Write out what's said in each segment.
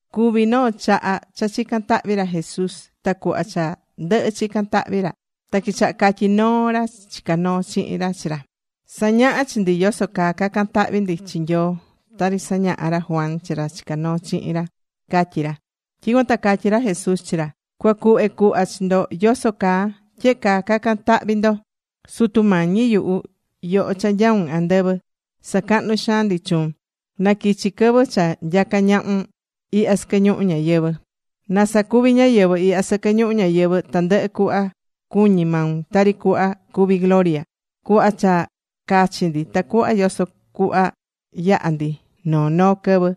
Cuví noo chaha cha chicán tahvi ra Jesús. Ta cuhva cha ndɨhɨ̱ chican tahvi ra, ta quichaha catyí noo ra chicá noo chihin ra chi ra: ―Sa̱ñaha chi ndi yoso caa cacan tahvi ndi chi Nyoo. Tari sañaha̱ ra Juan chi ra chica̱ noo chihin ra ―catyí ra. Tyicuan ta catyí ra Jesús chi ra: ―Cua cuhve cuhva chi ndo yoso caa. Tyehe caa ca̱can tahvi ndo: Sutu Mañi yuhu, yoho cha nyaun andɨvɨ. Sacahnu xaan ndi chuun. Na quichi quɨvɨ cha nyaca ñahun ihya sɨquɨ ñuhu ñayɨvɨ̱. Na sacuvi ñáyɨvɨ ihya sɨquɨ ñuhu ñayɨvɨ̱ tandɨhɨ cuhva cuñí maun, tari cuhva cuví gloria. Cu̱hva cha cachi ndi tacuhva yoso cuhva yaha ndi noo noo quɨvɨ.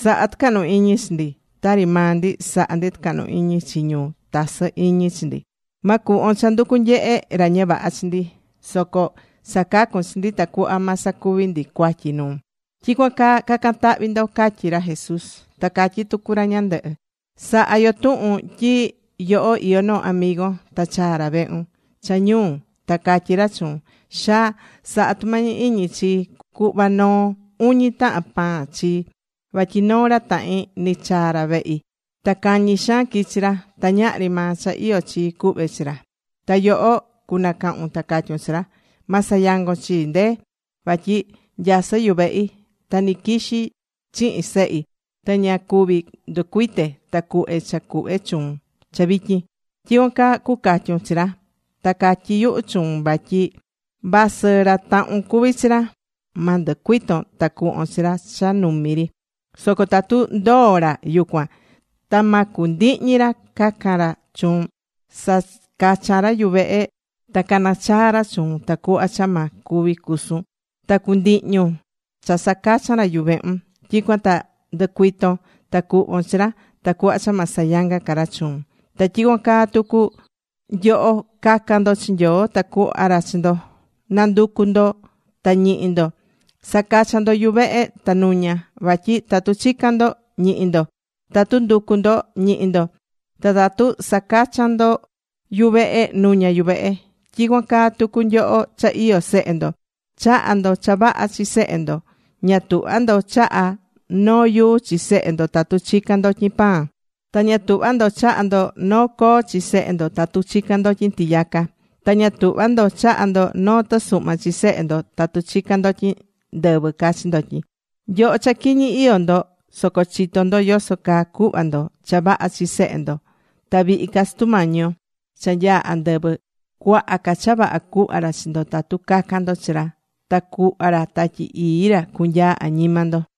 Sa̱ha tucahnu iñi chi ndi. Tari maa ndi sahá ndi tucahnu iñi chi ñu tasɨ iñi chi ndi. Ma cuhvon cha nducu nyehe ra ña vaha chi ndi, soco sacacu chi ndi tacuhva ma sacuvi ndi cuatyi nuun. Tyicuan caa cacan tahvi ndo ―catyí ra Jesús. Ta catyí tucu ra ñandɨhɨ: ―Sa̱ha yo tuhun tyi nyoho iyó noo amigon, ta chaa ra vehun cha ñuu ta catyí ra chuun: “Xaa, sa̱ha tumañi iñi chii, cu̱hva noo uñi tahan pan chii. Vatyi noo ra tahin nɨchaa̱ ra vehi. Ta cañi xaan quichi ra. Ta ñahri maa cha iyó chii cuhve chi ra.” Ta yoho cunacahun ta catyun chi ra: “Ma sayangon chii, ndee. Vatyi nyasɨ́ yuvehi. Ta nɨquixi chihin sehi. Ta ña cuvi nducuite ta cuhve cha cuhve chuun cha vityin.” Tyicuan caa cucatyun chi ra. Ta catyí yuhu chuun. Vasɨ ra tahun cuví chi ra, ma nducuiton ta cuhvon chi ra cha numi ri. Soco tatu ndoo̱ ra yucuan, ta ma cundihñi ra cacan ra chuun, sacachan ra yuvehun ta cana chaa ra chuun tacuhva cha ma cuvi cusun, ta cundihñun cha sacachan ra yuvehun, tyicuan ta nducuiton ta cuhvon chi ra, tacuhva cha ma sayanga ca ra chuun. Ta tyicuan caa tucu nyoho, ca̱can ndo chi Nyoo. Ta cuhva ra chi ndo. Na̱nducu ndo ta ñihi ndo. Sa̱cachan ndo yuvehe ta nuña. Vatyi tatu chican ndo, ñihi ndo. Tatu nducu ndo, ñihi ndo. Ta tatu sacachan ndo yuvehe, nuña yuvehe. ’Tyicuan caa tucu nyoho cha iyó sehe ndo. Chahá ndo cha vaha chi sehe ndo. Ña tuhvá ndo chahá noo yuu chi sehe ndo tatu chican ndotyin pan. Ta ña tuhvá ndo chaha ndo noo coo chi sehe ndo, tatu chicán ndotyin tiyaca. Ta ña tuhvá ndo chaha ndo noo tɨsuhma chi sehe ndo tatu chicán ndotyin ndɨvɨ cachi ndotyin. Nyoho cha quiñi iyó ndo, soco chitó ndo yoso caa cuhva ndo cha vaha chi sehe ndo. Ta vihi ca Sutu Mañi yo cha nyaá andɨvɨ, cuaha ca cha vaha cuhva ra chi ndo tatu cacan ndo chi ra. Ta cuhva ra Tatyi Ii ra cunyaa añima ndo.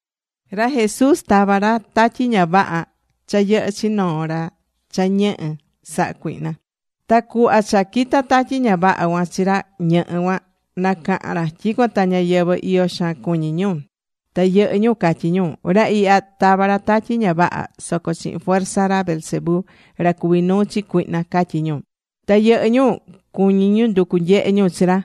Ra Jesús tavá ra tatyi ña vaha cha yɨhɨ́ chi noo ra cha ñɨhɨ sahá cuihna. Ta cuhva cha quita̱ tatyi ña vaha cuan chi ra ñɨhɨ cuan, nacaha̱n ra. Tyicuan ta ñáyɨvɨ, iyo xaan cuñí ñu. Ta yɨhɨ́ ñu catyí ñu: ―Ra ihya, tavá ra tatyi ña vaha soco chihin fuerza ra Beelzebú ra cuví nuu chi cuihna ―catyí ñu. Ta yɨhɨ́ ñu cuñí ñu nducu nyehe ñu chi ra,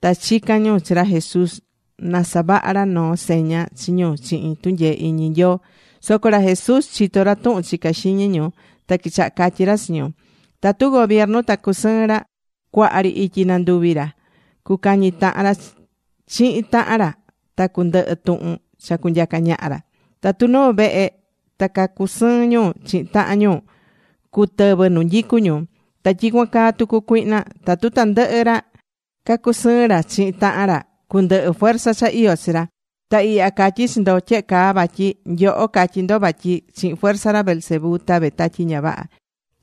ta chica̱n ñu chi ra Jesús na savaha ra noo seña chi ñu chihin tunyee iñi Nyoo. Soco ra Jesús chitó ra tuhun chicá xiñi ñu. Ta quichaha catyi ra chi ñu: ―Tatu gobiernu ta cacusɨɨn ra, cuaha ri ityi nanduvi ra, cucañi tahan ra chihin tahan ra, ta cundɨhɨ tuhun cha cunyaca ñaha ra. Tatu noo vehe ta cacusɨɨn ñu chihin tahan ñu, cutɨvɨ nu nyicú ñu. Ta tyicuan caa tucu cuihna. Tatu tandɨhɨ ra cacusɨɨn ra chihin tahan ra cundɨhɨ fuerza cha iyó chi ra. Ta ihya catyí chi ndo tyehe caa vatyi nyoho catyí ndo vatyi chihin fuerza ra Beelzebú tavé tatyi ña vaha.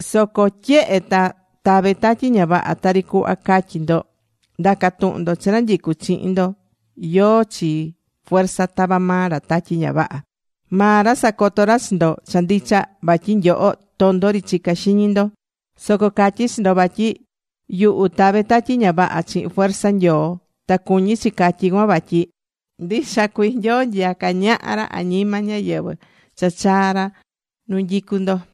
Soco tyehe ta tavé tatyi ña vaha tari cuhva catyí ndo, nda̱ca tuhun ndo chi ra nyicú chihin ndo yóó chi fuerza tavá maa ra tatyi ña vaha. Maa ra sacoto ra chi ndo cha ndicha vatyi nyoho tondo ri chicá xiñi ndo. Soco catyí chi ndo vatyi yuhu tave tatyi ña vaha chihin fuerza Nyoo. Ta cuñí chi catyí cuan vatyi ndicha cuii Nyoo ra nyacá ñaha añima ñáyɨvɨ cha chaa̱ ra nu nyicú ndo.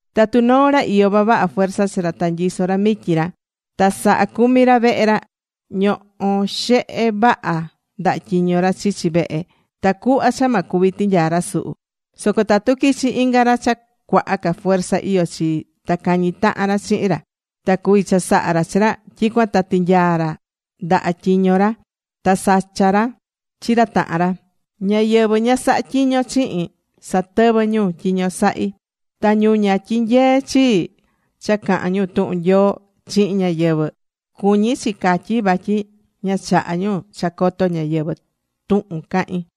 ’Tatu noo ra iyó vavaha fuerza chi ra ta nyisó ra mityi ra, ta sahá cumi ra vehe ra. Ñohó xehe vaha ndaha tyiño ra chichi vehe ra tacuhva cha ma cuvi tinyaa ra suhu. Soco tatu quichi inga ra cha cuaha ca fuerza iyó chi, ta cañi tahan ra chihin ra, ta cuvi chasaha ra chi ra, tyicuan ta tinyaa ra ndaha tyiño ra, ta sacha ra chi ra tahan ra. Ñáyɨvɨ ña sahá tyiño chihin, satɨvɨ́ ñu tyiño sahí. Ta ñu ña tyinyeé chii cha cahán ñu tuhun Nyoo chihin ñáyɨvɨ, cuñí chi catyi vatyi ña chahá ñu cha coto ñáyɨvɨ tuhun cahín.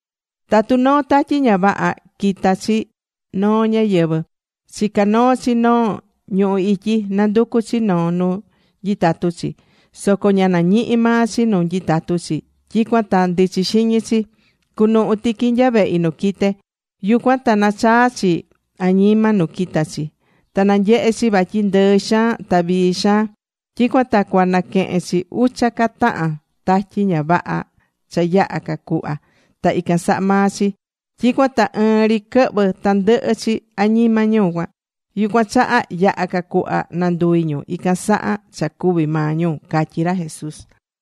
’Tatu noo tatyi ña vaha quita̱ chi noo ñáyɨvɨ, chicá noo chi noo ñuhu ityi, nanducú chi noo nu nyitatu chi. Soco ña nañihi maa chi nu nyitatu chi, tyicuan ta ndichi xiñi chi: “Cunuhu tiqui nya vehi nu quite̱.” Yucuan ta nachaa chi añima nu quita̱ chi. Ta nanyehe̱ chi vatyi ndɨɨ xaan ta vii xaan. Tyicuan ta cua naquehen chi ucha ca tahan tatyi ña vaha cha yaha ca cuhva ta ican saha maa chi. Tyicuan ta ɨɨn ri quɨhvɨ tandɨhɨ chi añima ñu cuan. Yucuan chaha yaha ca cuhva nanduvi ñu ican saha cha cuvi̱ maa ñu ―catyí ra Jesús.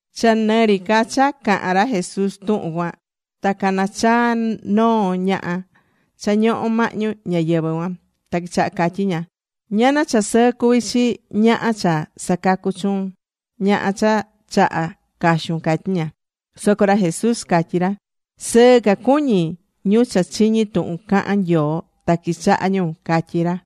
Cha nɨ ri ca cha cahán ra Jesús tuhun cuan, ta cana̱ chaa noo ñaha cha ñohó mahñu ñáyɨvɨ cuan. Ta quichaha catyí ña: ―Ñana cha sɨɨ cuví chi ñaha cha sacacu chuun ñaha cha chaha̱ caxun ―catyí ña. Soco ra Jesús catyí ra: ―Sɨɨ ca cuñí ñu cha chiñí tuhun cahán Nyoo ta quichahá ñu ―catyí ra.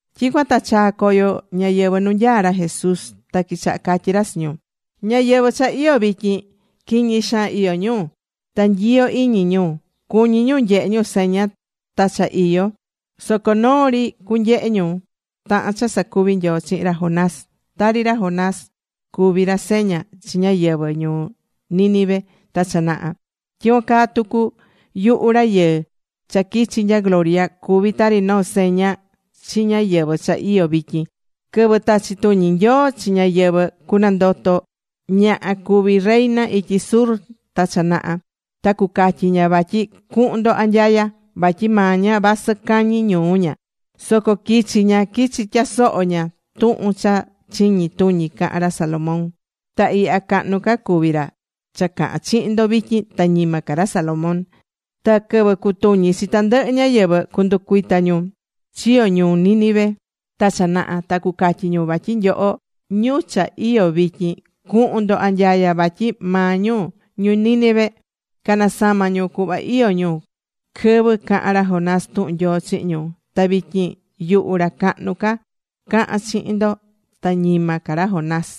Tyicuan ta chaa̱ coyo ñáyɨvɨ nu nyaá ra Jesús. Ta quichaha catyí ra chi ñu: ―Ñáyɨvɨ cha iyó vityin quiñi xaan iyó ñu. Ta nyiyo iñi ñu. Cuñí ñu nyehe ñu seña ta cha iyo. Soco noo ri cunyehe ñu, tahan cha sacuvi̱ Nyoo chihin ra Jonas. Tari ra Jonás cuvi̱ ra seña chi ñáyɨvɨ ñuu Nínive ta cha naha, tyicuan caa tucu yuhu Rayɨɨ cha quichi nya gloria, cuví tari noo seña chi ñáyɨvɨ cha iyó vityin. Quɨvɨ tachi tuñi Nyoo chi ñáyɨvɨ cunandoto ñaha cuví reina ityi sur ta cha naha, ta cucatyi ña vatyi cuhun ndo anyaya, vatyi maa ña vasɨ cañi ñuu ña, soco quichi̱ ña, quichi̱ tyasoho ña tuhun cha chiñi tuñi caha̱n ra Salomón. Ta ihya cahnu ca cuví ra cha cahán chihin ndo vityin ta ñima ca ra Salomón. Ta quɨvɨ cutuñi chi tandɨhɨ ñáyɨvɨ, cunducuita ñu chiyo̱ ñuu Nínive ta cha naha, ta cucatyi ñu vatyi nyoho ñu cha iyó vityin cuhun ndo anyaya, vatyi maa ñu ñu Nínive, canasama̱ ñu cuhva iyó ñu quɨvɨ caha̱n ra Jonás tuhun Nyoo chihin ñu. Ta vityin yuhu ra cahnu ca cahán chihin ndo ta ñima ca ra Jonás.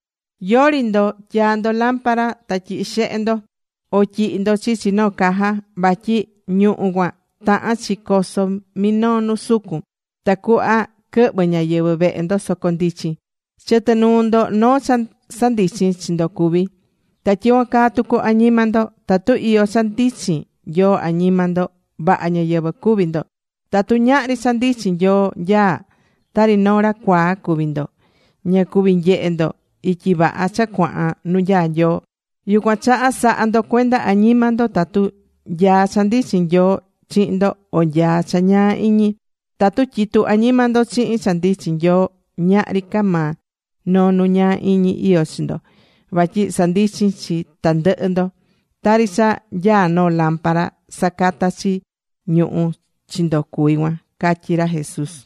’Yori ndo tyaa ndo lámpara ta tyihi xehe ndo, o tyihi ndo chichi noo caja. Vatyi ñuhu̱ cuan tahán chi coso minoo nu sucun. Tacuhva quɨhvɨ ñáyɨvɨ vehe ndo, soco ndichin. Chɨtɨ nuu ndo noo cha sandichin chi ndo cuví. Ta tyicuan caa tucu añima ndo, tatu iyó cha ndichin Nyoo añima ndo, vaha ñáyɨvɨ cuví ndo. Tatu ñahri cha ndichin Nyoo nyaá tari noo ra cuaa cuví ndo, ña cuví nyehe ndo ityi vaha cha cuahan nu nyaá Nyoo. Yucuan chaha sa̱ha ndo cuenda añima ndo. Tatu nyaá cha ndichin Nyoo chihin ndo, o nyaá cha ñaa iñi. Tatu tyitu añima ndo chihin cha ndichin Nyoo ñahri ca maa noo nu ñaa iñi iyó chi ndo, vatyi sandichin chi tandɨhɨ ndo. Tari cha nyaá noo lámpara sacatá chi ñuhu̱ chi ndo cuví cuan ―catyí ra Jesús.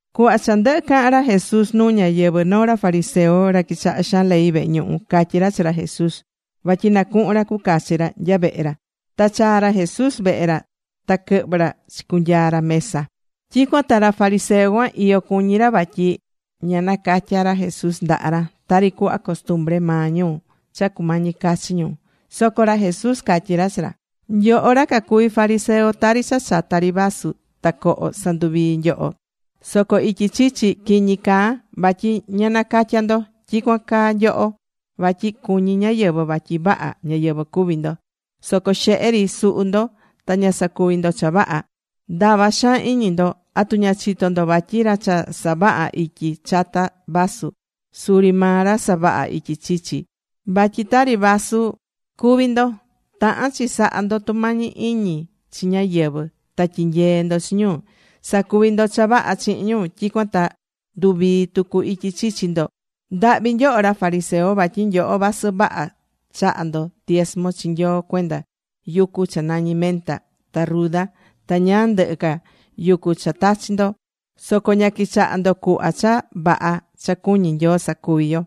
Cuhva cha ndɨhɨ̱ cahan ra Jesús nuu ñáyɨvɨ, noo ra fariseo, ra quichaha xaan ley vehe ñuhu, catyí ra chi ra Jesús, vatyi na cuhun ra cucachi ra nya vehe ra. Ta chaa̱ ra Jesús vehe ra. Ta quɨhvɨ̱ ra chicunyaa ra mesa. Tyicuan ta ra fariseo cuan iyo cuñí ra vatyi ña nacatya̱ ra Jesús ndaha ra, tari cuhva costumbre maa ñu cha cumañi cachi ñu. Soco ra Jesús catyí ra chi ra: ―Nyoho, ra cacuví fariseo, tari cha chata ri vaso ta coho sanduvii nyoho. Soco ityi chichi, quiñi caa. Vatyi ña nacatyá ndo. Tyicuan caa nyoho. Vatyi cuñí ñáyɨvɨ vatyi vaha ñáyɨvɨ cuví ndo. Soco xehe ri suhu ndo ta ña sacuví ndo cha vaha. Ndava xaan iñi ndo. ¿Atu ña chitó ndo vatyi ra cha savahá ityi chata vaso, suri maa ra savahá ityi chichi? Vatyi tari vaso cuví ndo. Tahán chi sahá ndo tumañi iñi chi ñáyɨvɨ, ta tyi̱nyee ndo chi ñu. Sa̱cuvi ndo cha vaha chihin ñu, tyicuan ta nduvii tucu ityi chichi ndo. ’¡Ndahvi nyoho ra fariseo! Vatyi nyoho vasɨ vaha chaha ndo diesmo chi Nyoo cuenda yucu cha nañí menta ta ruda ta ñáá ndɨhɨ ca yucu cha tachi̱ ndo, soco ña quichahá ndo cuhva cha vaha cha cuñí Nyoo sacuvi yo,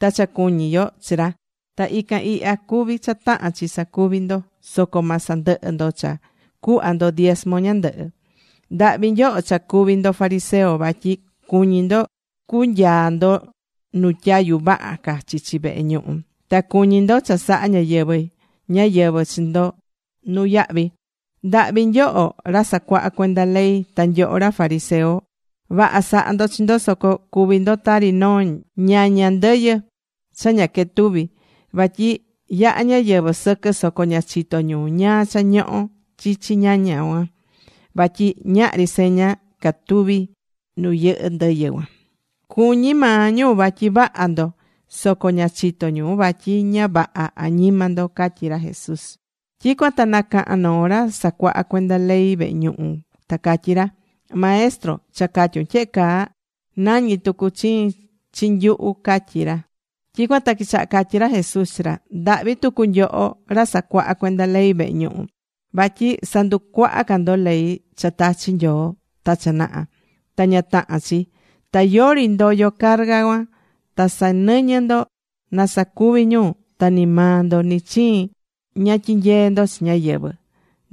ta cha cuñí yo chi ra. Ta ican ihya cuví cha tahán chi sacuvi ndo, soco ma sandɨhɨ ndo cha cuhva ndo diesmo ñandɨhɨ. ¡Ndahvi nyoho cha cuví ndo fariseo! vatyi cuñí ndo cunyaa ndo nu tyayu vaha ca chichi vehe ñuhu. Ta cuñí ndo cha saha ñáyɨvɨ ñáyɨvɨ chi ndo nuyahvi. ¡Ndahvi nyoho ra sacuaha cuenda ley, ta nyoho ra fariseo! Vaha sahá ndo chi ndo, soco cuví ndo tari noo ñaña ndɨyɨ cha ña quetuví. Vatyi yahá ñáyɨvɨ sɨquɨ soco ña chitó ñu ñáá cha ñohó chichi ñaña cuan. Vatyi ñahri seña catuví nu yɨhɨ́ ndɨyɨ cuan. Cuñí maa ñu vatyi vaha ndo, soco ña chitó ñu vatyi ña vaha añima ndo ―catyí ra Jesús. Tyicuan ta nacaha̱n noo ra sacuahá cuenda ley vehe ñuhu, ta catyí ra: ―Maestro, cha catyún tyehe caa, nañí tucu chiin chi nyuhu ―catyí ra. Tyicuan ta quichaha catyí ra Jesús chi ra: ―¡Ndahvi tucu nyoho ra casacuaha cuenda ley vehe ñuhu! Vatyi sanducuaha ca ndo ley cha tachi̱ Nyoo ta cha naha. Ta ña tahán chi. Ta yori ndoyó carga cuan, ta sanɨñɨ ndo na sacuvi ñu ta ni maa ndo nɨ chiin ña tyinyee ndo chi ñáyɨvɨ.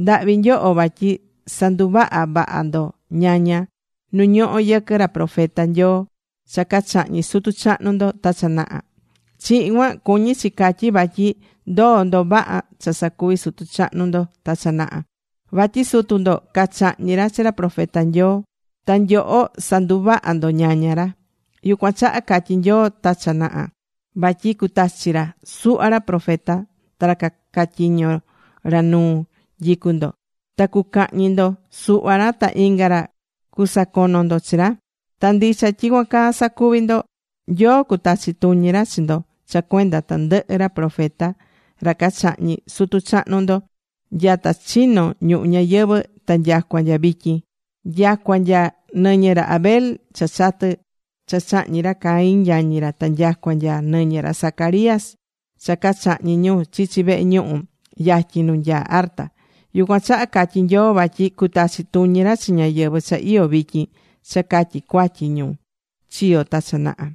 ¡Ndahvi nyoho! Vatyi sanduvahá vaha ndo ñaña nu ñohó yɨquɨ ra profeta Nyoo cha cachahñi̱ sutu chahnu ndo ta cha naha. Chihin cuan cuñí chi catyi vatyi ndoó ndo vaha cha sacuvi sutu chahnu ndo ta cha naha. Vatyi sutu ndo cachahñi̱ ra chi ra profeta Nyoo. Ta nyoho sanduvahá ndo ñaña ra. Yucuan chaha catyí Nyoo ta cha naha vatyi cutachi ra suhva ra profeta ta ra caca tyiño ra nu nyicú ndo. Ta cucahñi ndo suhva ra ta inga ra cusacono ndo chi ra. Ta ndicha tyicuan caa sacuví ndo. Nyoo cutachi tuñi ra chi ndo cha cuenda tandɨhɨ ra profeta ra cachahñi̱ sutu chahnu ndo nyata chino̱ ñuhu ñayɨvɨ̱ ta nyacua nya vityin. Nyacua nya nɨñɨ ra Abel cha chatɨ cha chahñi̱ ra Caín yañi ra, ta nyacua nya nɨñɨ ra Zacarías cha cachahñi̱ ñu chichi vehe ñuhu yatyin nu nyaa arta. Yucuan chaha catyí Nyoo vatyi cutachi tuñi ra chi ñáyɨvɨ cha iyó vityin cha catyi cuatyi ñu chiyo̱ ta cha naha.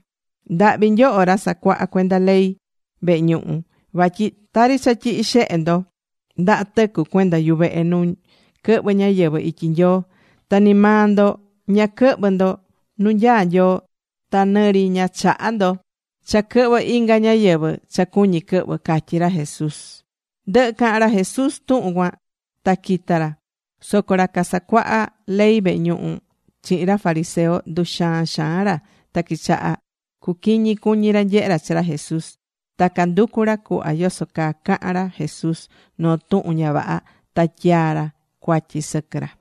¡Ndahvi nyoho ra casacuaha cuenda ley vehe ñuhu! Vatyi tari cha tyihí xehe ndo ndaha tɨcu cuenda yuvehe nu quɨhvɨ ñáyɨvɨ ityi Nyoo. Ta ni maa ndo ña quɨhvɨ ndo nu nyaá Nyoo. Ta nɨ ri ña chahá ndo cha quɨhvɨ inga ñáyɨvɨ cha cuñí quɨhvɨ ―catyí ra Jesús. Ndɨhɨ̱ cahan ra Jesús tuhun cuan, ta quita̱ ra. Soco ra casacuaha ley vehe ñuhu chihin ra fariseo, nduxaan xaan ra ta quichaha cuquiñi cuñi ra nyehe ra chi ra Jesús. Ta canducu ra cuhva yoso caa cahan ra Jesús noo tuhun ña vaha, ta tyaa ra cuatyi sɨquɨ ra.